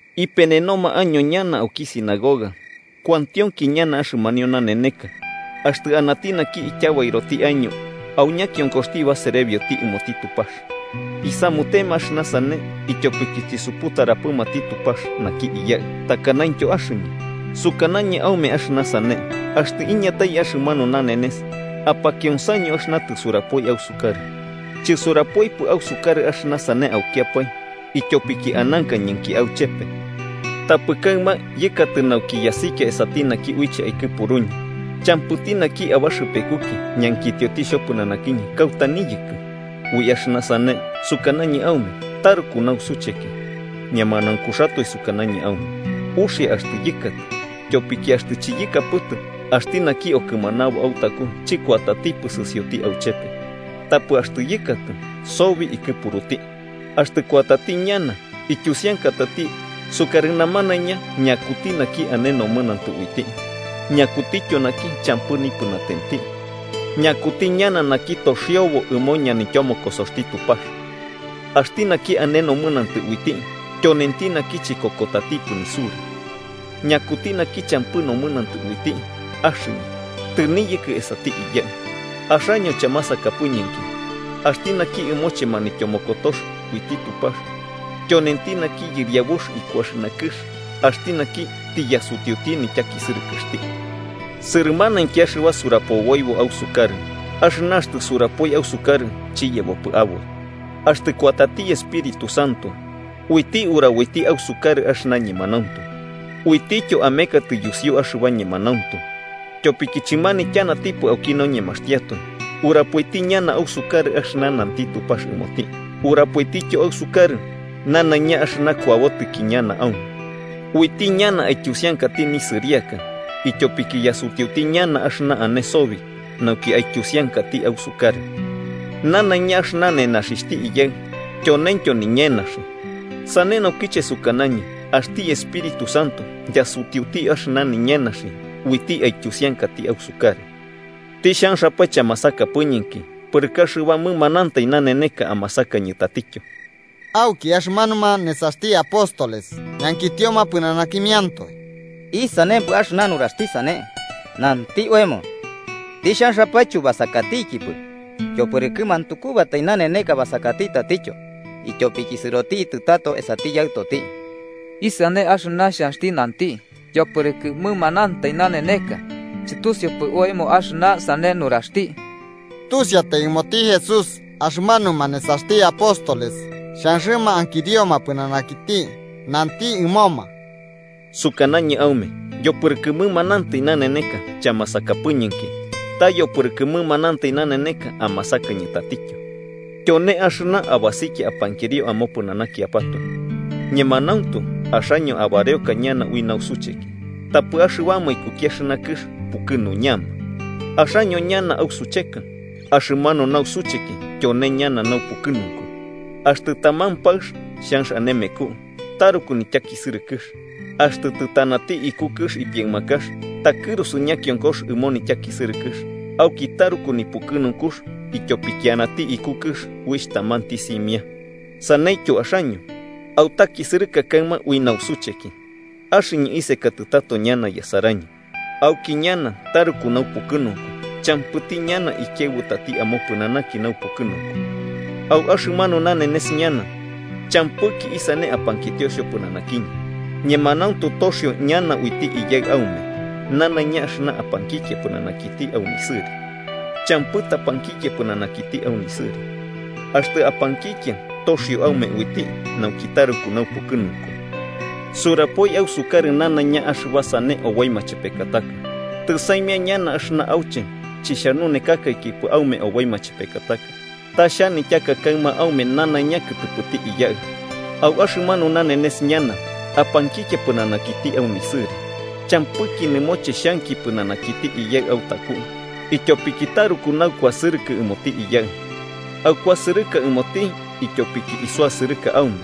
Ipenenoma año ñana auki sinagoga, kuantionki ñana axɨmanio naneneka, axtɨ anati naki ityabairoti año au ñakionkoxti baserebioti ɨmoti Tupax. Isamutema axɨna sane ityopiki chisuputaramatipɨ naki Iyaɨ, takanaintyo axɨñɨ. Sukanañɨ aume axɨna sane, axtɨ iñatai axɨmanu nanenes, apakionsaño axɨna tɨsurapoi ausukarɨ. “Chɨsurapoipɨ ausukarɨ axɨna sane aukiapae ityopiki anankañɨnki auchepe. Tapɨ kaɨma yɨkatɨ nauki yasikia esati naki uiche aikɨpuruñɨ, champɨti naki abaxɨpekuki ñankitioti xhopɨnanakiñɨ kauta niyɨkɨ. Ui axɨna sane sukanañɨ aume, taruku nausucheki. Ñemanaunkuxatoe sukanañɨ aume: uxia axtɨ yɨkatɨ. Tyopiki axtɨ chiyɨkapɨtɨ, axti naki okɨmanabo autaku chɨkuatatipɨ sɨsioti auchepe, tapɨ axtɨ yɨkatɨ, sobi ikɨpuruti. Axtɨ kuatati ñana, ityusiankatati sukarɨ namanaiña ñakuti naki ane nomɨnantɨ uiti, ñakutityo naki champɨ nipɨnatenti, ñakuti ñana naki toxio ɨmoti ñanityomokosoxti Tupax. Axti naki ane nomɨnantɨ uiti, tyonenti naki chikokotatipɨ nisura. Ñakuti naki champɨ nomɨnantɨ uiti: axɨñɨ, tɨniyɨkɨ esati Iyaɨ, axaño chamasakapɨñɨnki. Axti naki ɨmoche manityomokotox uiti Tupax: tyonenti naki yɨriabux iku axɨna kɨx, axti naki tiyasutiuti nityakisɨrɨkɨxti. “Sɨrɨmanainki axɨba surapoboibo ausukarɨ, axɨna axtɨ surapoi ausukarɨ chiyebopɨ aboi. Axtɨ kuatati Espíritu Santo, uiti uraboiti ausukarɨ axɨna ñemanauntu, uitityo amekatɨ yusiu axɨba ñemanauntu. Tyopiki chimanityanatipɨ auki noñemaxtiatoe, urapoiti ñana ausukarɨ axɨna nanti Tupax ɨmoti, urapoitityo ausukarɨ nanaiña axɨba kuabotɨki ñana aume. Uiti ñana aityusiankati nisɨriaka, ityopiki yasutiuti ñana axɨna ane sobi nauki aityusiankati ausukarɨ. Nanaiña axɨna nenaxixhti Iyaɨ, tyoneintyo niñenaxi. Sane naukiche sukanañɨ axti Espíritu Santo yasutiuti axɨna niñenaxi uiti aityusiankati ausukarɨ. “Tixhanxapae, chamasakapɨñɨnki, pɨrɨkɨ axɨba mɨmanantai naneneka amasakañɨ tatityo.” Auki axɨmanuma nesaxti apóstoles ñankitioma pɨnanakimiantoe: –¿Isanempɨ axɨna nuraxti sane? Nanti oemo tixhanxapae chubasakatikipɨ, yopɨrɨkɨ mantukubatai naneneka basakati tatityo, ityopiki sɨrotitɨ tato esati Yaɨtoti. ¿Isane axɨna xhanxti nanti “yopɨrɨkɨ mɨmanantai naneneka”? Chɨtusiupɨ oemo axɨna sane nuraxti. Tusiatai ɨmoti Jesús axɨmanuma nesaxti apóstoles xhanxɨma ankirioma pɨnanakiti, nanti ɨmoma: –Sukanañɨ aume, yopɨrɨkɨ mɨmanantai naneneka chamasakapɨñɨnki, ta yopɨrɨkɨ mɨmanantai naneneka amasakañɨ tatityo. Tyone axɨna abasikia apankirio amopɨnanakiapatoe. Ñemanauntu axaño abareoka ñana ui nausucheki, tapɨ axɨbama ikuki axɨna kɨx pukɨnuñama. Axaño ñana ausucheka, axɨmanu nausucheki tyone ñana naupukɨnunku. Axtɨ taman paɨx xhanx ane meku, taruku nityakisɨrɨkɨx. Axtɨ tɨtanati iku kɨx nipiaɨmakax, takɨrusu ñakionkox ɨmo nityakisɨrɨkɨx, auki taruku nipukɨnunkux ityopiki anati iku kɨx uixh tamanti simia. Saneityo axaño, autakisɨrɨka kaɨma ui nausucheki. Axɨñɨ isekatɨ tato ñana yasaraño, auki ñana taruku naupukɨnunku, champɨti ñana ikiaɨbutati amopɨnanaki naupukɨnunku. “Au axɨmanu nanenes ñana champɨki isane apankitio xhopɨnanakiñɨ. Ñemanauntu toxio ñana uiti Iyaɨ aume nanaiña axɨna apankikia pɨnanakiti au nisɨri. Champɨ tapankikia pɨnanakiti au nisɨri. Axtɨ apankikia toxio aume uiti, nauki taruku naupukɨnunku. “Surapoi ausukarɨ nanaiña axɨba sane oboi machepekataka. Tɨsaimia ñana axɨna auche chixhanunekakaikipɨ aume oboi machepekataka, ta xhanityaka kaɨma aume nanaiña kɨtɨpɨti Iyaɨ. Au axɨmanu nanenes ñana, apankikia pɨnanakiti au nisɨri. Champɨki nɨmoche xhanki pɨnanakiti Iyaɨ autaku, ityopiki taruku naukuasɨrɨkɨ ɨmoti Iyaɨ. Aukuasɨrɨka ɨmoti ityopiki isuasɨrɨka aume,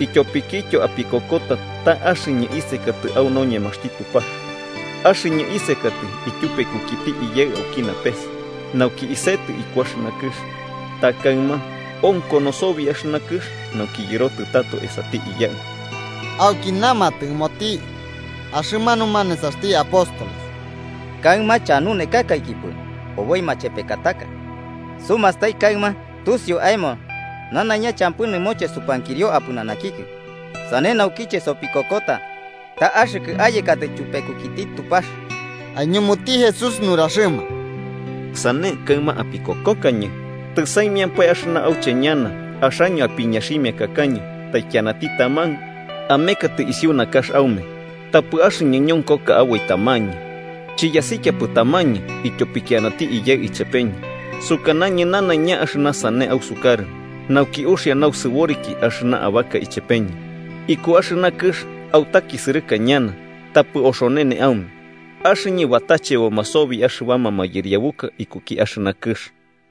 ityopikityo apikokota ta axɨñɨ isekatɨ au noñemaxti Tupax. Axɨñɨ isekatɨ ityupekukiti Iyaɨ auki napes nauki isetɨ iku axɨna kɨx, ta kaɨma onkono sobi axɨna kɨx nauki yɨrotɨ tato esati Iyaɨ. Auki namatɨ ɨmoti axɨmanuma nesaxti apóstoles: –Kaɨma chanunekakaikipɨ oboi machepekataka. Sumastai kaɨma tusiu aemo nanaiña champɨ nɨmoche supankirio apɨnanakikɨ. Sane naukiche sopikokota ta axɨkɨ ayekatɨ tyupekukiti Tupax. Aiñumuti Jesús nuraxɨma: –¿Sane, kaɨma apikokokañɨ? Tɨsaimiampae axɨna auche ñana, axaño apiñaximiakakaño taikianati taman amekatɨ isiu nakax aume, tapɨ axɨñɨ ñonkoka aboi tamañɨ. Chiyasikiapɨ tamañɨ ityopiki anati Iyaɨ ichepeñɨ. Sukanañɨ nanaiña axɨna sane ausukarɨ, nauki uxia nausɨboriki axɨna abaka ichepeñɨ. Iku axɨna kɨx, autakisɨrɨka ñana. Tapɨ oxonene aume, axɨñɨ batacheboma sobi axɨbama mayɨriabuka ikuki axɨna kɨx.